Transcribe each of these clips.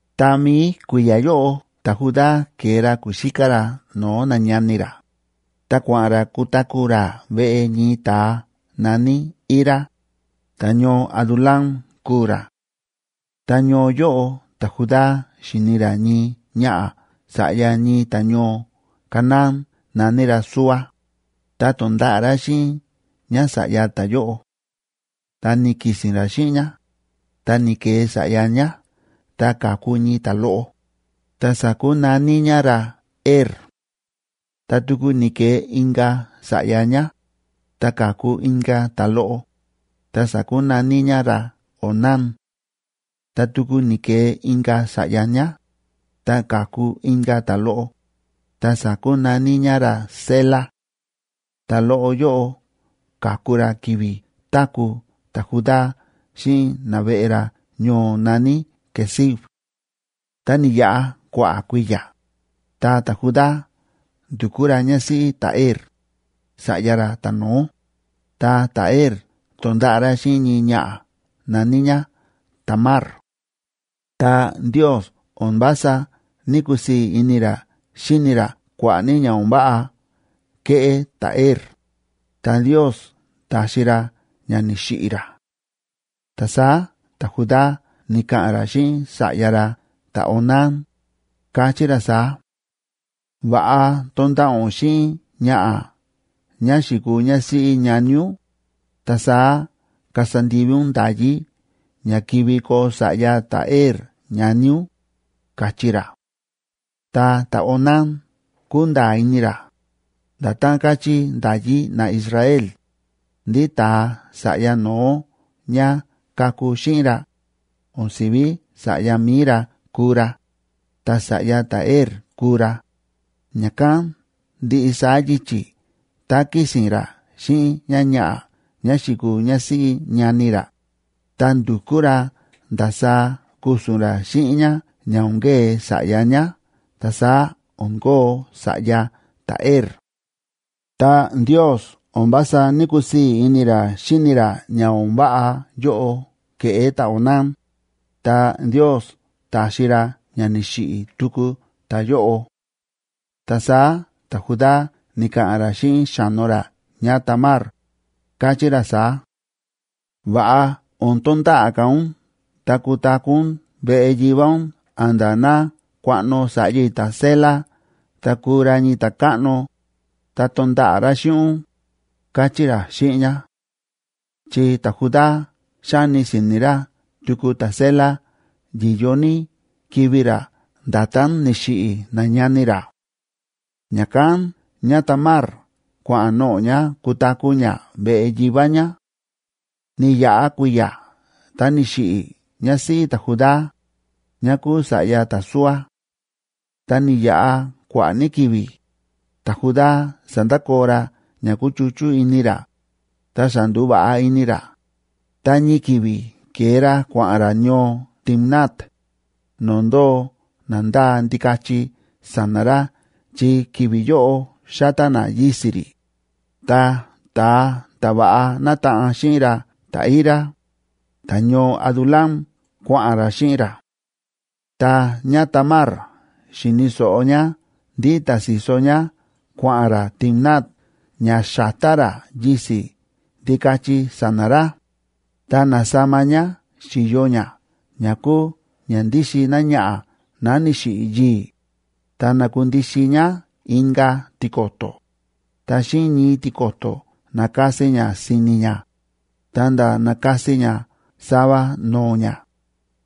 Tá mií kui̱ya̱ yóꞌo ta̱Judá ke̱e ra ku̱xíká ra no̱o̱ nañani ra, ta kua̱ꞌa̱n ra kutaku̱ ra veꞌe ñii ta̱a na̱ní Hira, ta̱ñoo Adulam kúu ra. Ta ñoo yóꞌo ta̱Judá xi̱ni ra ñii ñaꞌa̱ sa̱ꞌya ñii ta̱ñoo Canaán na̱ní ra Súa, ta to̱nda̱ꞌa̱ ra xíꞌin ñása̱ꞌya ta̱yóꞌo. Tá ni̱ki̱si̱n ra xíꞌin ñá, ta ni̱ke̱e sa̱ꞌya ñá, ta ka̱ku ñii ta̱loꞌo, ta sa̱kunaní ñá ra Er. Ta tuku ni̱ke̱e inka̱ sa̱ꞌya ñá, ta ka̱ku inka̱ ta̱loꞌo, ta sa̱kunaní ñá ra Onán. Ta tuku ni̱ke̱e inka̱ sa̱ꞌya ñá, ta ka̱ku inka̱ ta̱loꞌo, ta sa̱kunaní ñá ra Sela; ta̱loꞌo yóꞌo ka̱ku ra ki̱vi̱ táku̱ ta̱Judá xíꞌin naveꞌe ra ñoo na̱ní Quezib. Ta ni̱yaꞌa kua̱ꞌa̱ kui̱ya̱, ta ta̱Judá ndu̱kú ra ñásíꞌí ta̱Er, sa̱ꞌya ra ta̱no̱ó, ta ta̱Er to̱nda̱ꞌa̱ ra xíꞌin ñii ñaꞌa̱ na̱ní ñá Tamar. Ta Ndiosa o̱n vása ní‑kusii̱ ini ra xíni ra kua̱ꞌa̱ ní ña o̱n váꞌa kéꞌé ta̱Er, ta Ndios ta̱xi ra ña ni̱xiꞌi̱ ra. Ta saá ta̱Judá ni̱ka̱ꞌa̱n ra xíꞌin sa̱ꞌya ra ta̱Onán, káchí ra saá: ―Va̱ꞌa tonda̱ꞌa̱ ún xíꞌin ñaꞌa̱ ñá xi̱kuu ñásíꞌí ñani ún, ta saá kasa ndivi ún nda̱yí ña kivi koo sa̱ꞌya ta̱Er ñani ún ―káchí ra. Ta ta̱Onán kúnda̱a̱ ini ra, nda̱tán káchí nda̱yí naIsrael, ndí ta̱a sa̱ꞌya no̱ó ñá kaku xíꞌin ra, o̱n sívi sa̱ꞌya mi̱i ra kuu ra,b ta sa̱ꞌya ta̱Er kuu ra. Ña̱kán ndiꞌi saá yichi̱ tá kísi̱n ra xíꞌin ñáñaꞌa̱ ñá xi̱kuu ñásíꞌí ñani ra, ta ndu̱kú ra ndasaá ku̱su̱n ra xíꞌin ñá ña o̱n kee sa̱ꞌya ñá ta saá o̱n kóo sa̱ꞌya ta̱Er. Ta Ndios o̱n vása ní‑kusii̱ ini ra xíni ra ña o̱n váꞌa yóꞌo ke̱ꞌé ta̱Onán, ta Ndios ta̱xi ra ña ni̱xiꞌi̱ tuku ta̱yóꞌo. Ta saá ta̱Judá ni̱ka̱ꞌa̱n ra xíꞌin xa̱no ra ñáTamar, káchí ra saá: ―Va̱ꞌa o̱n tonda̱ꞌa̱ ka̱ ún ta kutaku̱ ún veꞌe yivá ún a̱nda̱ ná kuaꞌno sa̱ꞌya i̱ ta̱Sela ta kuu ra ñii ta̱káꞌno, ta tonda̱ꞌa̱ ra xíꞌin ún ―káchí ra xíꞌin ñá. Chi ta̱Judá xáni si̱ni̱ ra tuku ta̱Sela yi̱yo ní kivi̱ ra nda̱tán ni̱xiꞌi̱ nañani ra. Ña̱kán ñáTamar kua̱ꞌa̱n noꞌo̱ ñá kutaku̱ ñá veꞌe yivá ñá. Ni̱yaꞌa kui̱ya̱ ta ni̱xiꞌi̱ ñásíꞌí ta̱Judá, ñá kúu sa̱ꞌya ta̱Súa. Tá ni̱yaꞌa kua̱ꞌa̱ ní ki̱vi̱, ta̱Judá sa̱ndakoo ra ña kúchuchú ini ra, ta xa ndu̱va̱ꞌa ini ra, ta ñii ki̱vi̱ ke̱e ra kua̱ꞌa̱n ra ñoo Timnat, no̱o̱ ndóo na ndáa ndikachi sa̱na̱ ra chi ki̱vi̱ yóꞌo xátá na yisi̱ rí, ta ta̱a ta̱ va̱ꞌa nátaꞌan xíꞌin ra ta̱Hira, ta̱ñoo Adulam, kua̱ꞌa̱n ra xíꞌin ra. Tá ñáTamar xi̱ni̱ so̱ꞌo ñá ndí ta̱si̱so ñá kua̱ꞌa̱n ra Timnat ña xa̱tá ra yisi̱ ndikachi sa̱na̱ ra, ta na̱sama ñá si̱yo ñá ña kúu ña ndíxin náñaꞌa̱ ná ni̱xiꞌi̱ yii̱, ta na̱kundixin ñá inka̱ tiko̱to̱, ta xíꞌin ñii tiko̱to̱ na̱kasi ñá si̱ni̱ ñá, ta̱nda̱ na̱kasi ñá sava no̱o̱ ñá,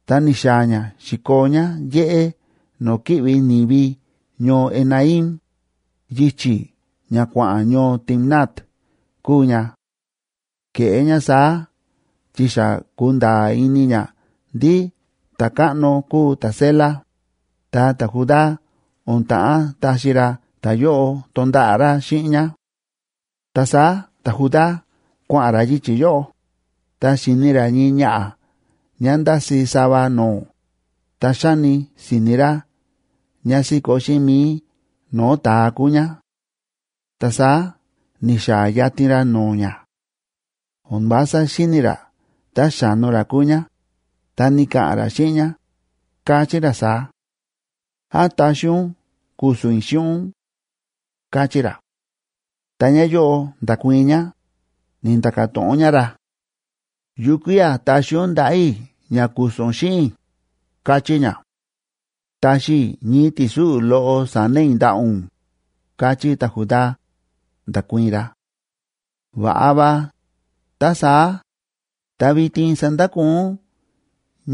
ta ni̱xaa̱ ñá xi̱koo ñá yéꞌé no̱o̱ kíꞌvi ni̱vi ñoo Enaim, yichi̱ ña kua̱ꞌa̱n ñoo Timnat kúu ña. Ke̱ꞌé ñá saá chi xa ku̱nda̱a̱ ini ñá ndí ta̱káꞌno kúu ta̱Sela, ta ta̱Judá o̱n ta̱ꞌán taxi ra ta̱yóꞌo tonda̱ꞌa̱ ra xíꞌin ñá. Ta saá ta̱Judá kua̱ꞌa̱n ra yichi̱ yóꞌo, ta xi̱ni ra ñii ñaꞌa̱ ñá ndási̱ sava no̱o̱, ta xáni si̱ni̱ ra ñá síkó xíꞌin mi̱i no̱o̱ ta̱a kúu ñá. Ta saá ni̱xaa̱ yatin ra no̱o̱ ñá; o̱n vása xíni̱ ra tá xa̱no ra kúu ñá, ta ni̱ka̱ꞌa̱n ra xíꞌin ñá, káchí ra saá: ―¿Án taxi ún ku̱su̱n i̱ xíꞌin ún? ―káchí ra. Ta ñáyóꞌo nda̱kuii̱n ñá, ni̱nda̱ka̱ to̱ꞌon ñá ra: ―¿Yukía̱ taxi ún ndaꞌa̱ i̱ ña ku̱su̱n ún xíꞌin i̱? ―káchí ñá. ―Taxi i̱ ñii ti̱súꞌu̱ loꞌo sa̱na̱ i̱ ndaꞌa̱ ún ―káchí ta̱Judá, nda̱kuii̱n ra. ―Va̱ꞌa va, tá saá. Ta vitin sandakoo ún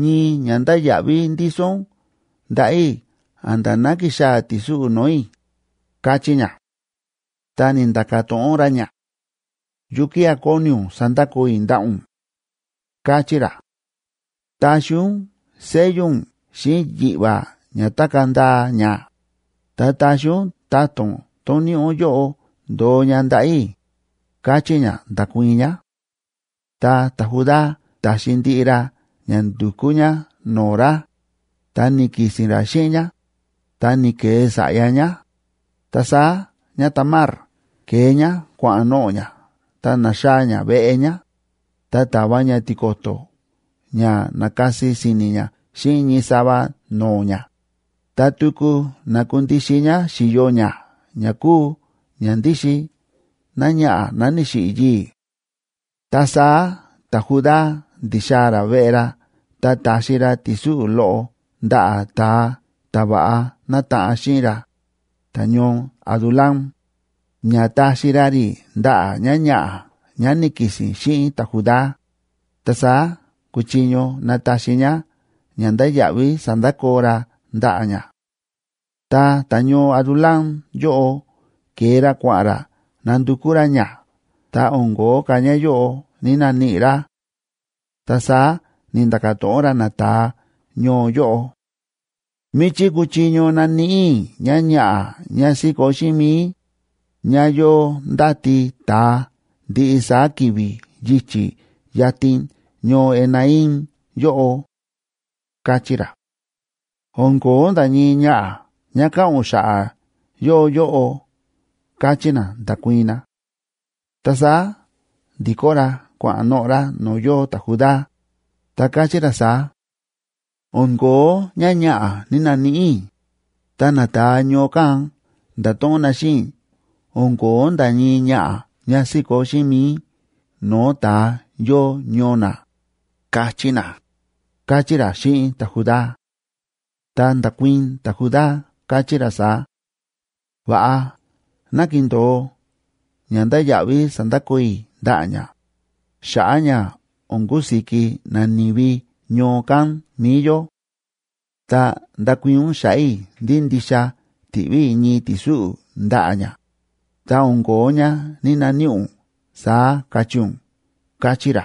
ñii ñandáya̱ꞌví ndíso ún ndaꞌa̱ i̱ a̱nda̱ ná kixaa̱ ti̱súꞌu̱ no̱o̱ i̱ ―káchí ñá. Ta ni̱nda̱ka̱ to̱ꞌon ra ñá: ―¿Yukía̱ kóni ún sandakoo i̱ ndaꞌa̱ ún? ―káchí ra. ―Taxi ún sello únc xíꞌin yiꞌva̱ ña tákaa̱ ndaa ña, ta taxi ún ta̱to̱n tón níꞌi ún yóꞌo ndo̱o ña ndaꞌa̱ i̱ ―káchí ñá, nda̱kuii̱n ñá. Ta ta̱Judá ta̱xi ndiꞌi ra ña ndu̱kú ñá no̱o̱ ra, ta ni̱ki̱si̱n ra xíꞌin ñá, ta ni̱ke̱e sa̱ꞌya ñá. Ta saá ñáTamar ke̱e ñá kua̱ꞌa̱n noꞌo̱ ñá ta na̱xaa̱ ñá veꞌe ñá, ta ta̱va ñá tiko̱to̱ ña na̱kasi si̱ni̱ ñá xíꞌin ñii sava no̱o̱ ñá, ta tuku na̱kundixin ñá si̱yo ñá ña kúu ña ndíxin náñaꞌa̱ ná ni̱xiꞌi̱ yii̱. Ta saá ta̱Judá ndi̱xaa̱ ra veꞌe ra ta ta̱xi ra ti̱súꞌu̱ loꞌo ndaꞌa̱ ta̱a ta̱ va̱ꞌa nátaꞌan xíꞌin ra, ta̱ñoo Adulam, ña taxi ra rí ndaꞌa̱ ñáñaꞌa̱ ñá ni̱ki̱si̱n xíꞌin ta̱Judá, ta saá kuchiño nataxi ñá ñandáya̱ꞌví sa̱ndakoo ra ndaꞌa̱ ñá. Ta ta̱ñoo Adulam yóꞌo ke̱e ra kua̱ꞌa̱n ra nandukú ra ñá, ta o̱n ko̱ó ka̱ ñáyóꞌo ní‑naníꞌi ra. Ta saá ni̱nda̱ka̱ to̱ꞌon ra nata̱a ñoo yóꞌo: ―¿Míchí kuchiño naníꞌi i̱ ñáñaꞌa̱ ñá síkó xíꞌin mi̱i, ñá yóo ndáti ta̱a ndiꞌi saá ki̱vi̱ yichi̱ yatin ñoo Enaim yóꞌo? ―káchí ra. ―O̱n ko̱ó nda̱ ñii ñaꞌa̱ ñá káꞌa̱n ún xa̱ꞌa̱ yóo yóꞌo ―káchí na, nda̱kuii̱n na. Ta saá ndi̱kó ra kua̱ꞌa̱n noꞌo̱ ra no̱o̱ yóo ta̱Judá, ta káchí ra saá: ―O̱n ko̱ó ñáñaꞌa̱ ní‑naníꞌi i̱, ta nata̱a ñoo kán nda̱to̱ꞌon na xíꞌin i̱ o̱n ko̱ó nda̱ ñii ñaꞌa̱ ñá síkó xíꞌin mi̱i no̱o̱ ta̱a yóo ñoo na, ka̱chí na ―káchí ra xíꞌin ta̱Judá. Ta nda̱kuii̱n ta̱Judá, káchí ra saá: ―Va̱ꞌa, ná kindo̱o ñandáya̱ꞌví sa̱ndakoo i̱ ndaꞌa̱ ñá, xa̱ꞌa̱ ña o̱n kusiki nani̱vi ñoo kán mi̱i yó; ta ndakuii̱n ún xa̱ꞌa̱ i̱ ndí ndixa ti̱ꞌví i̱ ñii ti̱súꞌu̱ ndaꞌa̱ ñá, ta o̱n ko̱ó ñá ní‑naníꞌi ún, saá kachí ún ―káchí ra.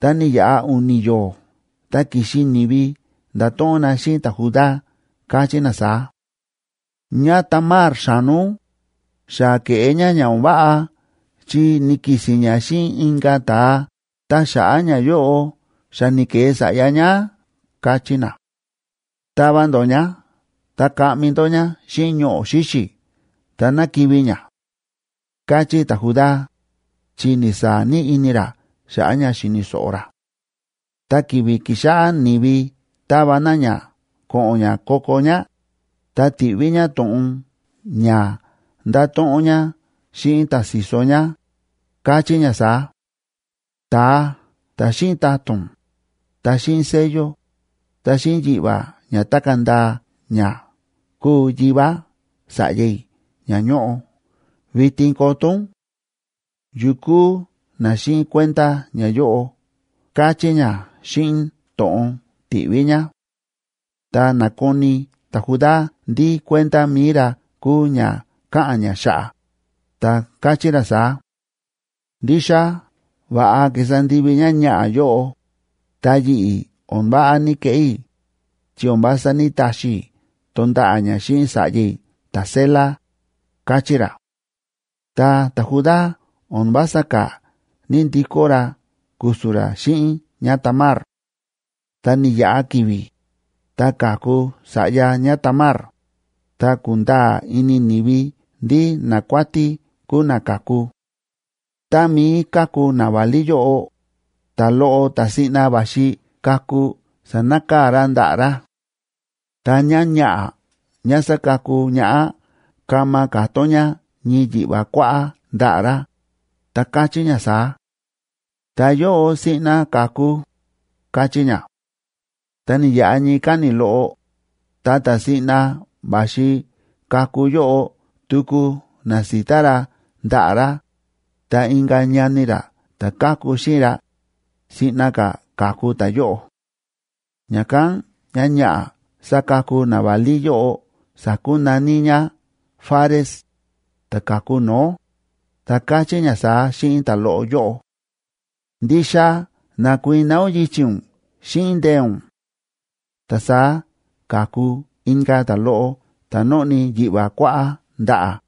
Ta ni̱yaꞌa u̱ni̱ yo̱o̱, ta ki̱xi ni̱vi nda̱to̱ꞌon na xíꞌin ta̱Judá, káchí na saá: ―ÑáTamar, xa̱no ún, xa ke̱ꞌé ñá ña o̱n váꞌa chi ni̱ki̱si̱n ñá xíꞌin inka̱ ta̱a, ta xa̱ꞌa̱ ñayóꞌo xa ni̱ke̱e sa̱ꞌya ñá ―káchí na. ―¡Tava ndó ñá ta kaꞌmi ndó ñá xíꞌin ñoꞌo̱ xíxi̱ ta ná kivi̱ ñá! ―káchí ta̱Judá, chi ni̱saa̱ ní ini ra xa̱ꞌa̱ ña xi̱ni̱ so̱ꞌo ra. Tá ki̱vi̱ ki̱xáꞌá ni̱vi táva na ñá ko̱ꞌo̱n ñá ko̱ko̱ ñá, ta ti̱ꞌví ñá to̱ꞌon ña ndato̱ꞌon ñá xíꞌin ta̱si̱so ñá, káchí ñá saá: “Ta̱a ta̱ xíꞌin ta̱to̱n, ta xíꞌin sello, ta xíꞌin yiꞌva̱ ña tákaa̱ ndaa ña, kúu yivá sa̱ꞌya i̱ ña ñóꞌo. Vitin koto ún, ¿yukú na xíꞌin kuenda ñayóꞌo?”, káchí ñá xíꞌin to̱ꞌon ti̱ꞌví ñá. Tá na̱koni ta̱Judá ndí kuenda mi̱i ra kúu ña káꞌa̱n ñá xa̱ꞌa̱, ta káchí ra saá: ―Ndixa va̱ꞌa ki̱sa ndivi ñáñaꞌa̱ yóꞌo, ta yi̱ꞌi̱ o̱n váꞌa ni̱keꞌé i̱, chi o̱n vása ní‑taxi i̱ tonda̱ꞌa̱ ñá xíꞌin sa̱ꞌya i̱ ta̱Sela ―káchí ra. Ta ta̱Judá o̱n vása ka̱ ní‑ndikó ra ku̱su̱n ra xíꞌin ñáTamar. Ta ni̱yaꞌa ki̱vi̱, ta ka̱ku sa̱ꞌya ñáTamar, ta ku̱nda̱a̱ ini ni̱vi ndí nakuátí kúu na ka̱ku. Tá mií káku naválí yóꞌo, ta̱loꞌo ta̱ siꞌna va̱xi kaku sa̱nakaa̱ ra ndaꞌa̱ ra. Ta ñáñaꞌa̱ ñá sákaku ñaꞌá kama ka̱tón ñá ñii yiꞌva̱ kuáꞌá ndaꞌa̱ ra, ta káchí ñá saá: ―Ta̱yóꞌo siꞌna ka̱ku ―káchí ñá. Ta ni̱yaꞌa ñii káni̱ loꞌo, ta ta̱ siꞌna va̱xi kaku yóꞌo tuku na̱sita ra ndaꞌa̱ ra, ta inka̱ ñani ra ta̱ káku xíꞌin ra, siꞌna ka̱ ka̱ku ta̱yóꞌo. Ña̱kán ñáñaꞌa̱ sákaku naválí yóꞌo sa̱kunaní ñá Fares,d ta̱ ka̱ku no̱ó, ta káchí ñá saá xíꞌin ta̱loꞌo yóꞌo: ―¡Ndixa na̱kuiná ún yichi̱ ún xíꞌin ndee̱ ún! Ta saá ka̱ku inka̱ ta̱loꞌo ta̱ nóꞌni yiꞌva̱ kuáꞌá ndaꞌa̱,